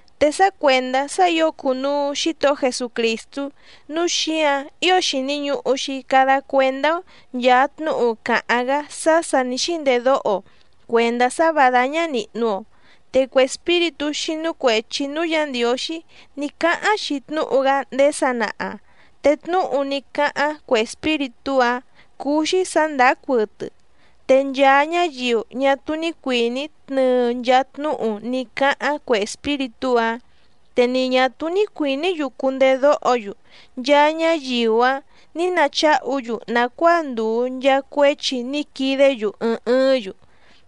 Te sá cuèndá sá ǐo cùnuu Xítohó Jesucrìstú, núu xíǎⁿ ío xìni ñuhu‑xi cada cuendá‑ó nchàa tnúhu càháⁿ‑gá sá sà ní xíndedóho‑o cuèndá sá vǎ dáñá nìhnu‑o. Te cue espíritú xínú cuèchi núú Yǎ Ndiǒxí ní cáháⁿ‑xi tnúhu‑gá ndéé sanaha, te tnúhu ní cáháⁿ cue espíritú‑áⁿ cúú‑xí sǎ ndàá cuɨtɨ. Te nchaa ñáyiu ñá túú ní cuìní tnɨɨ nchaa tnúhu ní cáháⁿ cue espíritú‑áⁿ, te ni ñà túú ní cuìní‑yu cundedóho‑yu, nchaa ñáyiu‑áⁿ nǐ nacháhu‑yu nàcuáa ndùu nchaa cuéchi ní quidé‑yu ɨɨⁿ ɨɨ́ⁿ‑yu.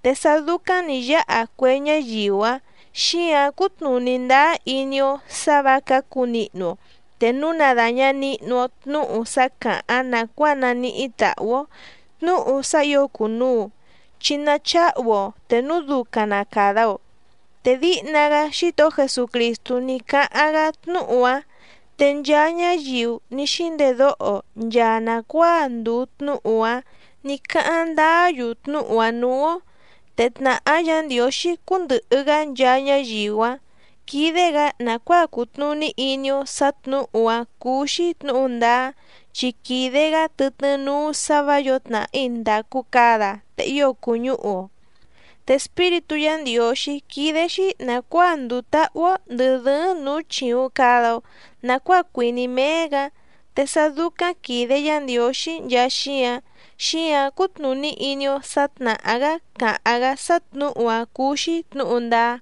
Te sá dúcáⁿ nǐ yáha cue ñáyiu‑áⁿ, xíǎⁿ cútnùní ndáá iní‑ó sǎ vǎ cǎcu nihnu‑o te núu na dàña nihnu‑o tnúhu sá càháⁿ nàcuáa naníhí tàhú‑ó, tnúhu sá ǐo cùnuu, chi nacháhu‑o te núu ducaⁿ na càda‑o. Te díhna‑gá Xítohó Jesucrìstú ní cáháⁿ‑gá tnúhu‑áⁿ te nchaa ñáyiu ní xíndedóho nchaa nàcuáa ndùu tnúhu‑áⁿ nǐ cáháⁿ ndáá‑yu tnúhu‑áⁿ nǔú‑ó. Te tnàhá Yǎ Ndiǒxí cúndɨ̀hɨ‑gá nchaa ñáyiu‑áⁿ quídé‑gǎ nàcuáa cutnùní iní‑ó sǎ tnǔhu‑áⁿ cúú‑xí tnǔhu ndáá, chi quìde‑gá tɨtnɨ́ núú sǎ vǎ yǒo tnàhí ndàcu cada te ío cùñúhu‑o. Te Espíritú Yǎ Ndiǒxí quídé‑xí nàcuáa nduu táhú‑ó ndɨ̀ dɨ́ɨ́ⁿ nǔú chìuⁿ cada‑o nacuáa cuìní méé‑gǎ. Te sá dúcáⁿ quìde Yá Ndiǒxí nchaa xíǎⁿ, xíǎⁿ cútnùní iní‑ó sǎ tnàhá‑gá càháⁿ‑gá sá tnǔhu‑áⁿ cúú‑xí tnǔhu ndáá.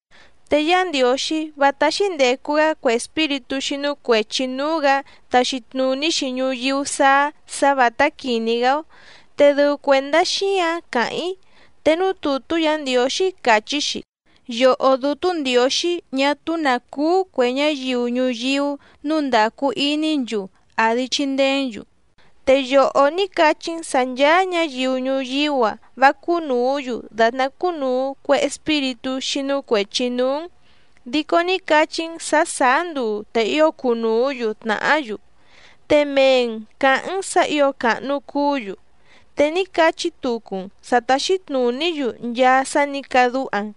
Te Yá Ndiǒxí vá táxí ndècu‑gá cue espíritú xínú cuèchi núú‑gǎ taxi tnùní‑xi ñuyíú sáá sǎ vǎtá quìní‑gá‑ó, te dɨu cuèndá xíǎⁿ càháⁿ‑í. Te núú tùtú Yǎ Ndiǒxí càchí‑xi: Yòhó Dútú Ndiǒxí ñá túú nǎ cúú cuè ñáyiu ñuyíú nǔu ndacu iní‑n‑yu, àdi chindeé‑n‑yu. Te yòhó ní cachí‑n sǎ nchàa ñáyiu ñuyíú‑a vá cúnùú‑yu dàtná cúnùu cue espíritú xínú cuèchi núú‑n, dico ní cachí‑n sǎ sàá nduu te ío cunùú‑yu tnàhá‑yu, te mee‑n cǎháⁿ‑n sǎ ǐo càhnu cuú‑yu, te ní cachí tucu‑n sǎ táxí tnùní‑yu nchaa sá nǐ cadúha‑n.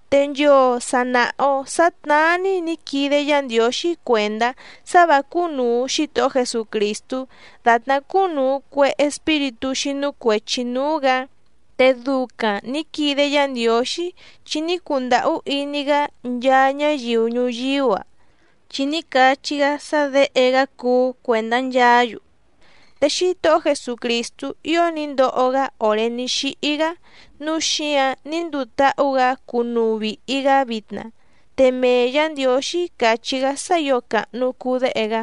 Te nchoo sa nàha‑o sá tnáá‑ní nǐ quide Yá Ndiǒxí cuèndá sá vǎ cúnùu Xítohó Jesucrìstú dàtná cúnùu cue espíritú xínú cuèchi núú‑gǎ. Te ducaⁿ nǐ quide Yá Ndiǒxí chi ní cundàhú iní‑gá nchaa ñáyiu ñuyíú‑a, chi ní cachí‑gá sá Děhe‑gá cuú cuèndá nchaá‑yu, te Xítohó Jesucrìstú ío ní ndoho‑gá òré ní xíhí‑gá, núu xíǎⁿ ní nduu táhú‑gǎ cúnùu vihi‑gá vitna. Te mee Yǎ Ndiǒxí càchí‑gá sá ǐo càhnu cuu Déhe‑gá.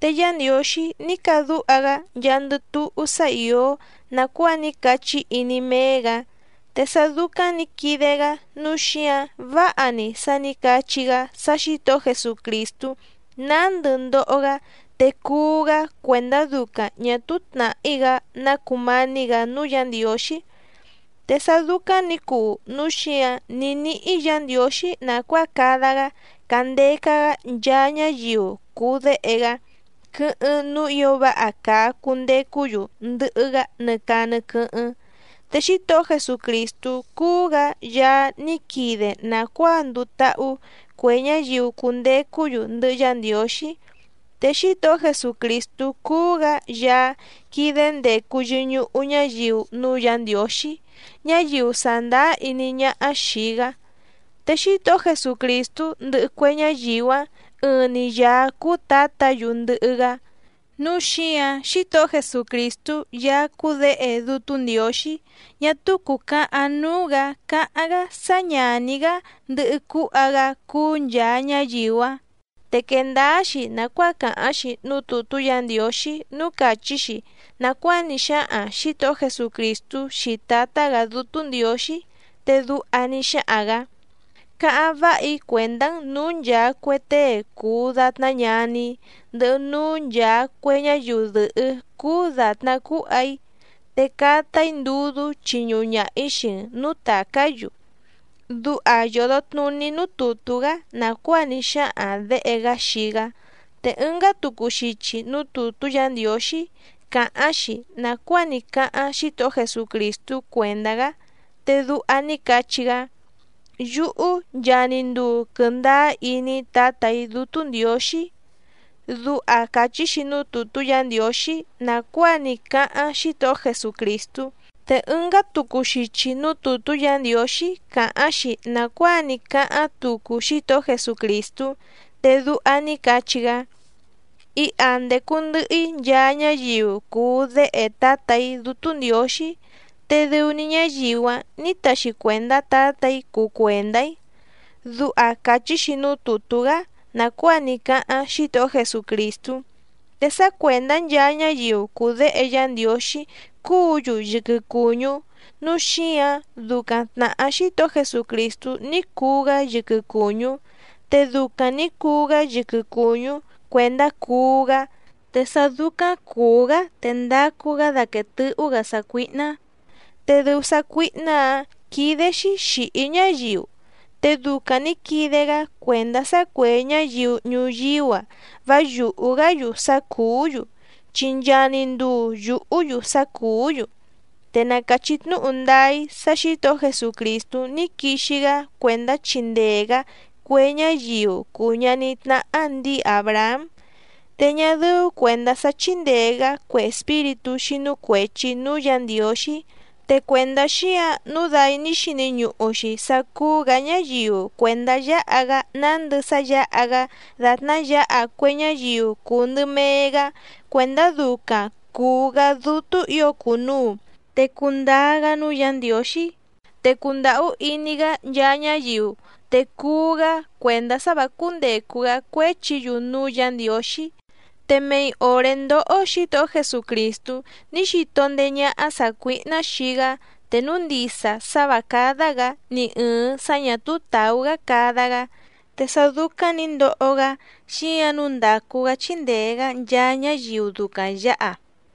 Te Yá Ndiǒxí ní cadúha‑gá nchaandɨ túhú sá ìó nàcuáa ní cachí iní méé‑gǎ, te sá dúcáⁿ nǐ quide‑gá nǔu xíǎⁿ váha‑ni sá nǐ cachí‑gá sá Xǐtohó Jesucrìstú nándɨ ndoho‑gá te cuú‑gá cuèndá ducaⁿ ñà túú tnàhí‑gá ná cùmání‑gǎ núú Yǎ Ndiǒxí. Te sá dúcáⁿ nǐ cuu núu xíǎⁿ ní níhí Yǎ Ndiǒxí nàcuáa cada‑gá càndeca‑gá nchaa ñáyiu cùu déhe‑gá quɨ́hɨ́ⁿ núú ǐo váha càa cundecú‑yu ndɨhɨ‑gá nɨ caa nɨ quɨ́hɨ́ⁿ. Te Xítohó Jesucrìstú cúú‑gǎ Yaá ní quide nàcuáa nduu táhú cue ñáyiu cundecú‑yu ndɨhɨ Yá Ndiǒxí. Te Xítohó Jesucrìstú cúú‑gǎ Yaá quídé ndècu yɨñuhu ñáyiu núú Yǎ Ndiǒxí ñáyiu sàndáá iní ñáhá xìi‑gá, te Xítohó Jesucrìstú ndɨhɨ cue ñáyiu‑áⁿ ɨɨⁿ‑ni Yàá cúú Tǎtǎ‑yu ndɨhɨ‑gá, núu xíǎⁿ Xítohó Jesucrìstú Yaá cúú Děhe Dútú Ndiǒxí ñá túú cùcahaⁿ núú‑gǎ càháⁿ‑gá sá ñàní‑gá ndɨhɨ cúha‑gá cúú nchàa ñáyiu‑áⁿ. Te quèe ndáá‑xi nàcuáa càháⁿ‑xi núú tùtú Yǎ Ndiǒxí núú càchí‑xi nàcuáa ní xáhaⁿ Xǐtohó Jesucrìstú xii Tǎtá‑gǎ Dútú Ndiǒxí, te duha ní xáhaⁿ‑gǎ: Cáháⁿ váha‑í cuèndá‑n nǔú nchàa cue tée cùu datná ñaní‑í ndɨhɨ núú nchàa cue ñáyiu dɨ̀hɨ́ cúú dàtná cúha‑í, te cata‑í ndudú chiñuhu ñaha‑ǐ xii‑n nǔú tàcá‑yu. Duha yòdo tnuní núú tùtú‑gá nàcuáa ní xáhaⁿ Děhe‑gá xii‑gá. Te ɨngá tucu xichi núú tùtú Yǎ Ndiǒxí càháⁿ‑xi nàcuáa ní cáháⁿ Xítohó Jesucrìstú cuèndá‑gá, te duha ní cachí‑gá: Yúhú nchaa‑ni nduu quɨndáá iní‑í Tǎtà‑í Dútú Ndiǒxí. Duha càchí‑xi núú tùtú Yǎ Ndiǒxí nàcuáa ní cáháⁿ Xítohó Jesucrìstú. Te ɨngá tucu xichi núú tùtú Yǎ Ndiǒxí càháⁿ‑xi nàcuáa ní cáháⁿ tucu Xítohó Jesucrìstú, te duha ní cachí‑gá: Iha ndècu ndɨhɨ‑í nchaa ñáyiu cùu déhe Tǎtà‑í Dútú Ndiǒxí, te dɨu‑ni ñáyiu‑áⁿ nǐ taxi cuèndá Tǎtà‑í cuu cuèndá‑í. Duha càchí‑xi núú tùtú‑gá nàcuáa ní cáháⁿ Xítohó Jesucrìstú. Te sá cuèndá nchaa ñáyiu cùu déhe Yá Ndiǒxí cúǔ‑yu yɨquɨ cùñú, núu xíǎⁿ ducaⁿ tnàhá Xítohó Jesucrìstú ní cuu‑gá yɨquɨ cùñú, te ducaⁿ nǐ cuu‑gá yɨquɨ cùñú cuèndá cuú‑gá, te sá dúcáⁿ cùú‑gá te ndacu‑gá daquèe tɨ́hú‑gǎ sácuíhná, te dɨu sácuíhná‑ǎⁿ quídé‑xí xìhí ñáyiu. Te ducaⁿ nǐ quide‑gá cuèndá sá cuè ñáyiu ñuyíú‑a vá yùhú‑gá‑yu sá cùú‑yu, chi nchaa‑ni nduu yùhú‑yu sá cùú‑yu. Te na càchí tnúhu ndáá‑í sá Xǐtohó Jesucrìstú ní quixi‑gá cuèndá chindee‑gǎ cue ñáyiu cùu ñaní tnáhá ndǐi Àbrahám, te ñá dɨ́ú cuèndá sá chíndèe‑gá cue espíritú xínú cuèchi núú Yǎ Ndiǒxí. Te cuèndá xíǎⁿ nǔu dai ní xini ñuhu‑xi sá cúú‑gǎ ñáyiu cuèndá yǎha‑gá nándɨ sá yǎha‑gá dàtná yǎha cue ñáyiu cùu ndɨ mee‑gá cuèndá ducaⁿ cùu‑gá dútú ǐo cùnuu te cuu ndáá‑gá núú Yǎ Ndiǒxí, te cundàhú iní‑gá nchaa ñáyiu te cuú‑gá cuèndá sá vǎ cúndècu‑gá cuéchi‑yu núú Yǎ Ndiǒxí. Te mei òré ndóhó Xǐtohó Jesucrìstú ní xito ndéé ñáhá sàcuíhná xii‑gá te núu ndisa sá vǎ cádá‑gǎ ni ɨ̀ɨⁿ sá ñà túú tàú‑gá cada‑gá, te sá dúcáⁿ nǐ ndoho‑gá xíǎⁿ nǔu ndácú‑gǎ chíndèe‑gá nchaa ñáyiu ducaⁿ yǎha.